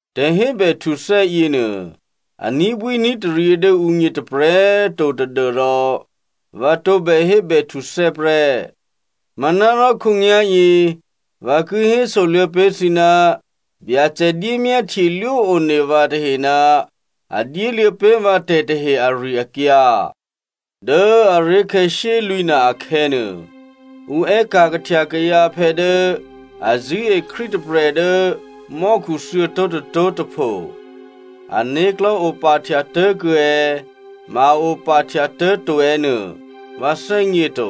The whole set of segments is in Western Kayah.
Tè̤hébèhtuthè́ yěnuô a ní̤bwíní̤taryě dố ǔgně tôprè̤꤮ to tadû́rò vǎ tǒbè hébèhtuthè́ prè́. Manárò khǒnyá̤yě vǎ ki hésoluô̌ pé̤ thǐ ná Byacè dyémyáhtyelwó one vǎ tahe ná a dyéluô̌ pé̤ vǎ tè̤tahe ari-akyǎ. Dố aré̤khè̌ shyélwǐ̤na akhè̌nuô, ǔ è́ka̤ kahtya kayǎphè̌ dố a zṳ̂́e Krístu tôprè̤ dố mò́khu thuô̌tó̤ tôtó̤ tôpho. (Ané̤klò̤́ opahtyatố̤ kuô̌ è̌, ma a opahtyatố̤ to è̌ nuô, vǎ thè́gně to.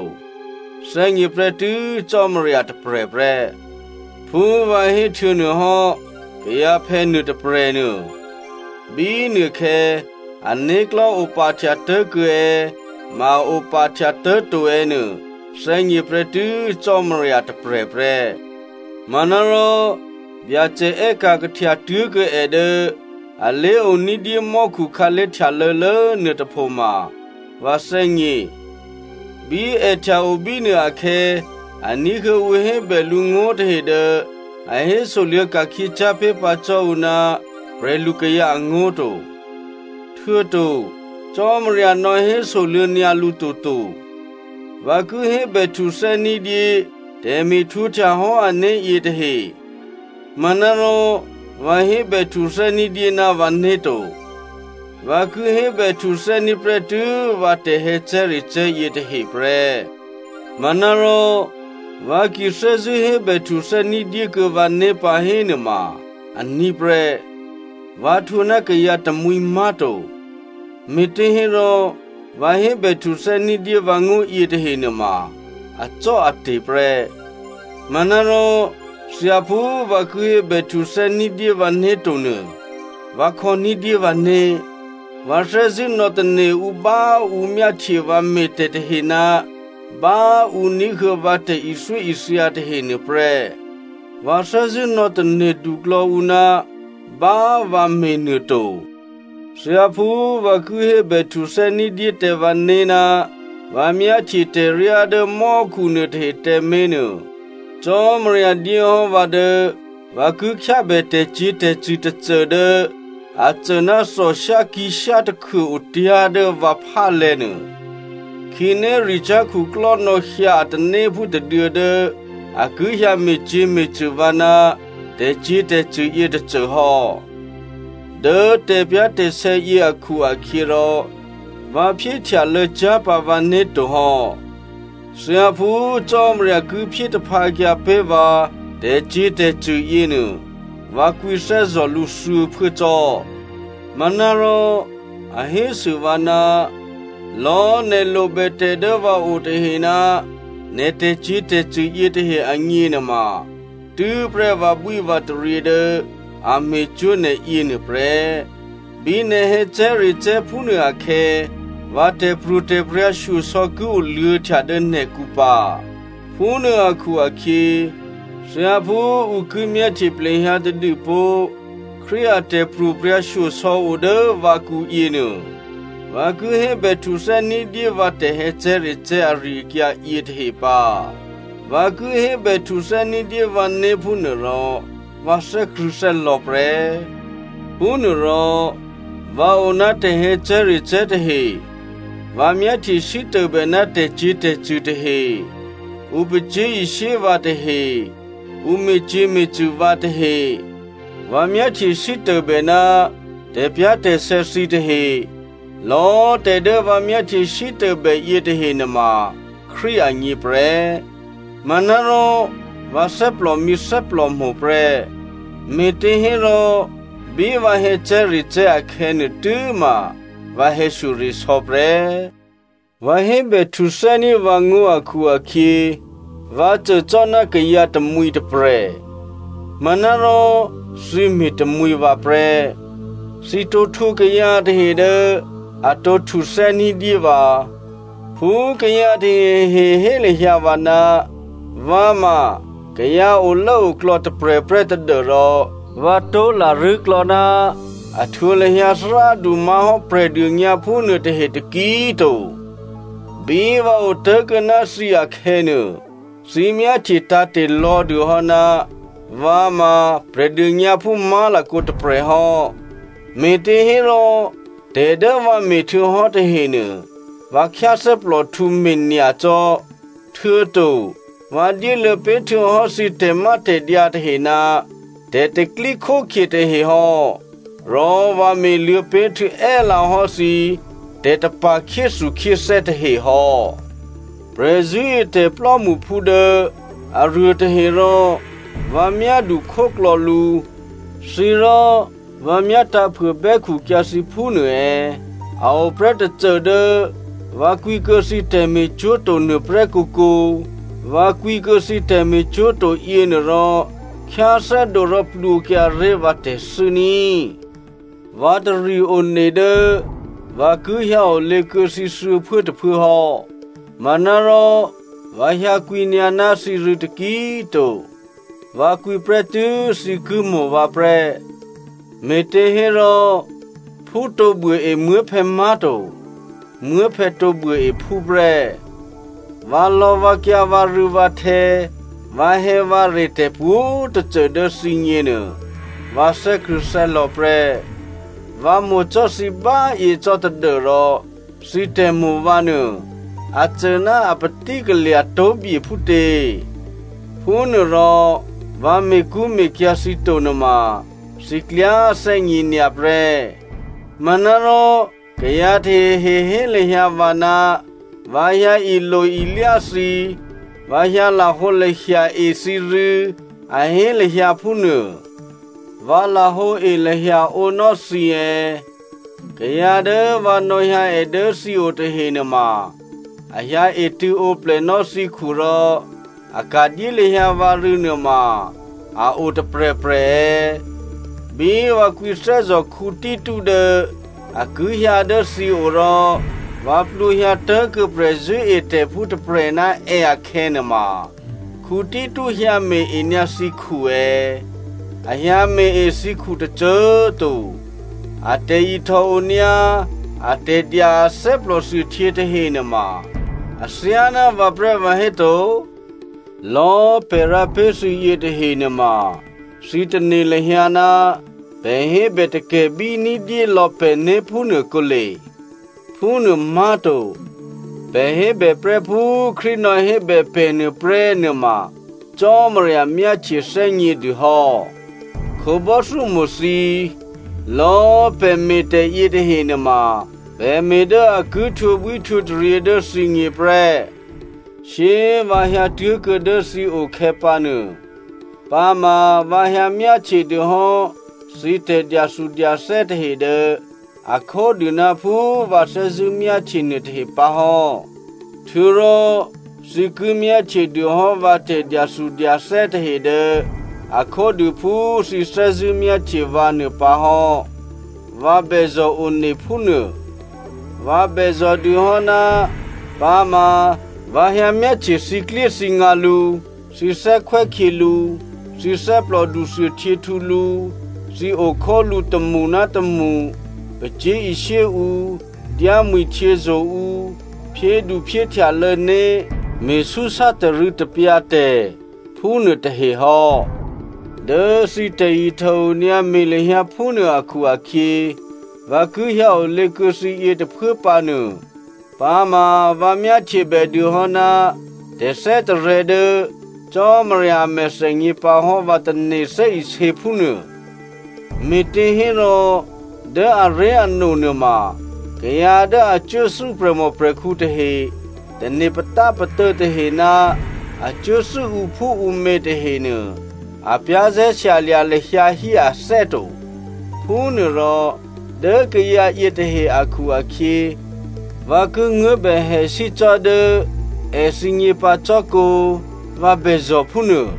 Thè́gně prè́tû́ Cò́marya tôprè̤ prè́.) Phú vǎ héhtuô̌nuôhò́, kayǎphè̌ nuôtôprè̤ nuô, bínuôkhè̌ ané̤klò̤́ opahtyatố̤ kuô̌ è̌ ma a opahtyatố̤ to è̌ nuô thè́gně prè́tû́ Cò́marya tôprè̤ prè́. Manárò Byacè è́ka̤ kahtya tuố̤kuô̌ è dố alé̤o ní̤dyé mò́khu khǎlé̤ htyalô̌lố nuôtôpho ma vǎ thè́gně. Bí è htya o bínuô akhè̌ a ní̤huô̌ ǔ hébè lǔ ngó̤tahe dố a hésoluô̌ ka̤khyěcyá̤ pé̤ pǎ cò́ ǔ ná prè̤lukayǎ angó̤ to, htuô̌to Cò́marya nò̌ hésoluô̌ nyǎ lǔ toto. Vǎ ki hébèhtuthè́ ní̤dyé tè̤me̤htwǒhtya hò́ ané̤ yětahe. Manárò vǎ hébèhtuthè́ ní̤dyé ná vǎné̤ to. Vǎ ki hébè htuthè́ní̤ prè́tû́ vǎ tè̤hè̌cè̤́recè̤́ yětahe prè́. Manárò vǎ ki thè́zṳ̂́ hébèhtuthè́ ní̤dyé kuô̌ vǎné̤ pǎ hénuôma aní̤ prè́, vǎ htwǒ ná kayǎ tamwǐ má̤to, me̤těhérò vǎ hébèhtuthè́ ní̤dyé vǎngó̤ yětahe nuôma acò́ate̤ prè́. Manárò thyáphú vǎ ki hébè htuthè́ ní̤dyé vǎné̤ to nuô, vǎ khò̌ní̤dyé vǎné̤. Vǎ thè́zṳ̂́ nò̌tane̤ ǔ bá ǔ myáhtye vǎ me̤tè̤tahe ná bá ǔ ní̤huô̌ vǎ tè̤ithyóithya tahe nuôprè́. Vǎ thè́zṳ̂́ nò̌ tane̤duklò̌ ǔ ná bá vǎ me̤nuô to. Thyáphú vǎ ki hébè htuthè́ ní̤dyé tǎ vǎné̤ ná vǎ myáhtye tè̤ryá dố mò́khu nuôtahe tǎmé̤nuô, Cò́marya dyé hò́ vǎ dố vǎ ki khyábè tè̤cyě̤tè̤cṳ̂ tôcô dố a cô ná thòshyá kǐ̤shyá takhuô otyá̤ dố vǎ phálè̤̌nuô. Khǐnéricyá̤ khuklò́ nò̌hyǎ a tanéphú tôduô̌ dố a ki hyǎ me̤cyě̤me̤cṳ̂ vǎ ná tè̤cyě̤tè̤cṳ̂ yětôcô hò́. Dố tè̤pyá̤tè̤sè̌ yě akhu-akhyěrò vǎ phyéhtyalô̌cyá̤ pǎ vǎné̤ to hò́. Thyáphú Cò́marya ki phyé taphǎkyǎ pé̤ vǎ tè̤cyě̤tè̤cṳ̂ yěnuô, vǎ kwǐthè́zò̤ lǔ thuô̌phuố cò́. Manárò a hésû vǎ, “Lò̤́ nè̤ lobè tè̤ dố vǎ o tahe ná nè̤ tè̤cyě̤tè̤cṳ̂ yětahe agně nuôma tû́prè́ vǎbwívǎtaryě dố a me̤cwó̤ nè̤ yěnuô prè́. Bí nè̤ hè̌cè̤́recè̤́ phúnuô akhè̌, vǎ tè̤pro̤tè̤prya̤ shyosò̌ ki oluô̌htya dố nè̤kǔ pǎ.” Phúnuô akhu-akhyě thyáphú ǔ ki myáhtye plehyǎ tadû pó̤ Krístu a tè̤pro̤prya̤ shyosò̌ o dố vǎkǔ yěnuô, vǎ ki hébè htuthè́ ní̤dyé vǎ tè̤hè̌cè̤́recè̤́ ari-akyǎ yětahe pǎ. Vǎ ki hébè htuthè́ ní̤dyé vǎné̤ phúnuôrò vǎ thè́krṳ̂̌thè́lò̌ prè́. Phúnuôrò vǎ o ná tè̤hè̌cè̤́recè̤́ tahe, vǎ myáhtye sítôbè ná tè̤cyě̤tè̤cṳ̂ tahe, ǔ pacyé̤ishyé vǎ tahe, ǔ me̤cyě̤me̤cṳ̂ vǎ tahe, vǎ myáhtye sítôbè ná tè̤pyá̤tè̤sè̌ thǐ tahe, lò̌꤮ tè̤ dố vǎ myáhtye sítôbè yětahe nuôma Krístu agně prè́, manárò vǎ thè́plòmǐ thè́plòmo̤ prè́. Me̤těhérò bí vǎ hè̌cè̤́recè̤́ akhè̌nuô, tû́ma vǎ hè̌shyoresò̌ prè́. Vǎ hébè htuthè́ní̤ vǎngó̤ akhu-akhyě vǎ cô cò́ ná kayǎ tamwǐ tôprè̤. Manárò thǐ me̤tamwǐ vǎ prè́. Thǐ tǒ htwǒ kayǎ tahe dố a tǒ htuthè́ ní̤dyé vǎ. Phú kayǎ tahehe hé lahyǎ vǎ, vǎ ma kayǎ olốoklò̌ tôprè̤ prè́ tadû́rò vǎ tó̤ larṳ̂́ klò̌ná a htwǒ lahyǎ thárádu má̤hò́ Prè̤dônyǎphú nuôtahe taki꤮ to. Bí vǎ otố̤kuô̌ ná thǐ akhè̌nuô, thǐ myáhtye tǎ̤te̤ lò̌dû hò́ ná vǎ ma Prè̤dônyǎphú má̤lakǒ tôprè̤ hò́, me̤těhérò tè̤ dố vǎ me̤htuô̌hò́ tahenuô, vǎ khyáthè́plòhtǔ me̤ nyacò́, htuô̌to vǎ dyéluô̌ pé̤ htuô̌hò́ thǐ tè̤mátè̤dyǎ tahe ná tè̤pro̤tè̤prya̤ tahe hò́, rò vǎ me̤luô̌ pé̤ htuô̌ è́lǎ hò́ thǐ tè̤tapa̤ khyéthukhyéthè́ tahe hò́. Prè̤zṳ̂́etè̤ plò́mṳphú dố aruô tahe rò vǎ myádukhóklò̌ lǔ, thǐ rò vǎ myá tǎ̤phuôbè́khu kyǎ thǐ phúnuô è̌? A o prè́ tôcô dố vǎ kwǐkuô̌ thǐ tè̤me̤cwó̤ to nuôprè́ kǒkǒ. Vǎ kwǐkuô̌ thǐ tè̤me̤cwó̤ to yěnuôrò khyáthè́dǒ rò plwǒkyǎré̤ vǎ tè̤thû́ ní꤮. Vǎ tari one dố vǎ ki hyǎ olě kuô̌ thǐ thuô̌phuốtôphuố hò́. Manárò vǎ hyǎkwǐnyǎ ná thǐ rû̌ taki꤮ to. Vǎ kwǐ prè́tû́ thǐ ki mo̤ vǎ prè́, me̤těhérò phú tǒ buôe muố̤phè̌ má̤to, muố̤phè̌ tǒ buôe phú prè́. Vǎlò̌vǎkyǎ vǎrû̌vǎhtè̌, vǎhè̌vǎre, tè̤pwǒ̤꤮ tôcô dố thǐgně nuô, vǎ thè́krṳ̂̌thè́lò̌ prè́. Vǎ mo̤ cò́ thǐ báyě cò́ tadû́rò thǐ tè̤mo̤ vǎ nuô a cô ná apatí kalya̤ tó̤bye phútě? Phúnuôrò vǎ me̤kṳ́me̤kyǎ̤ thǐ to nuôma thǐ klyá thè́gněnyǎ prè́. Manárò kayǎ tahehe hé lahyǎ vǎ ná vǎ hyǎ ilo-ilyá thǐ, vǎ hyǎ lahǒlahya e thǐrû̌, a hé lahyǎ phúnuô. Vǎ lahǒe lahyaǒ nò́ thǐ è̌? Kayǎ dố vǎ nò̌hyǎ è dố thǐ o tahe nuôma a hyǎ etṳ̂̌ǒplè nò́ thǐkhu rò a ka̤dyé lahyǎ vǎ rû̌ nuôma a o tôprè̤prè̤ è̌? Bí vǎ kwǐthè́zò̤ Tito dố a ki hyǎ dố thǐ o, rò vǎ plwǒhyǎ tố̤kuô̌ prè̤zṳ̂́etè̤phú tôprè̤ ná è akhè̌ nuôma, Tito hyǎme̤-e nyǎ thǐkhu è̌? A hyǎ me̤-e thǐkhu tôcô꤮ to. A tè̤ihtòonyǎ, atè̤dya a thè́plòthuôhtyě tahe nuôma athyáná vǎ prè́ vǎhéto? Lò̌꤮ pè̤ rǎ pé̤ thǐ yětahe nuôma, thǐ tane̤ lahyǎ ná pè̤ hébè takè̤bí ní̤dyé lò̌ pè̤né̤ phúnuô kǒle. Phúnuô má̤to, pè̤ hébèprè́ phú Krístu nò̌hébè pè̤ nuô prè́ nuôma Cò́marya myáhtye thè́gnědû hò́. Khǒbò́thyómo̤ thǐ꤮, lò̌꤮ pè̤ me̤tè̤ yětahe nuôma pè̤ me̤ dố a ki htwǒbwíhtwǒtaryě dố thǐgně prè́. Shyé꤮ vǎ hyǎtuố̤kuô̌ dố thǐ o khè̌pǎnuô, pǎma vǎ hyǎ myáhtye dûhò́ thǐ tè̤dyathudyathè́ tahe dố a khódû ná phú vǎ thè́zṳ̂́ myáhtye nuôtahe pǎ hò́, htuô̌rò thǐ ki myáhtye dûhò́ vǎ tè̤dyathudyathè́ tahe dố a khódû phú thǐ thè́zṳ̂́ myáhtye vǎ nuô pǎ hò́, vǎ bèzò̤one phúnuô. Vǎ bèzò̤ dûhò́ ná pǎma vǎ hyǎmyáhtye thǐklyéthǐngǎ lǔ, thǐ thè́khwè́khyělǔ, thǐ thè́plòdu thuôhtyěhtǔ lǔ, thǐ okhólǔ tômṳ ná tômṳ, pacyé̤ishyé ǔ, dyámwi̤htyězo̤ ǔ, phyéduphyéhtyalô̌ né̤, me̤súsá tarû̌tapyǎ tè̤, phúnuô tahe hò́. Dố thǐ tè̤ihtòonyǎ me̤ lahyǎ phúnuô akhu-akhyě, vǎ ki hyǎ olě kuô̌ thǐ yětôphuố pǎnuô, pǎma vǎ myáhtyebè dû hò́ ná tè̤thè́tarè̤̌ dố Cò́marya a mèthènyě pǎ hò́ vǎ tane̤ thè́isě phúnuô. Me̤těhérò, dố aré̤ano nuôma kayǎ dố a cuốthû́ prè̤mòprè̤khǔ tahe, tane̤ patápatô̌ tahe ná a cuốthû́ ǔphúǔmě tahenuô, a za̤ ní̤ lahyǎ hí ané̤ to. Phúnuôrò dố kayǎ yětahe akhu-akhyě vǎ ki nguố̤bèhèsí cò́ dố èthǐgně pǎ cò́kǒ vǎ bèzò̤ phúnuô.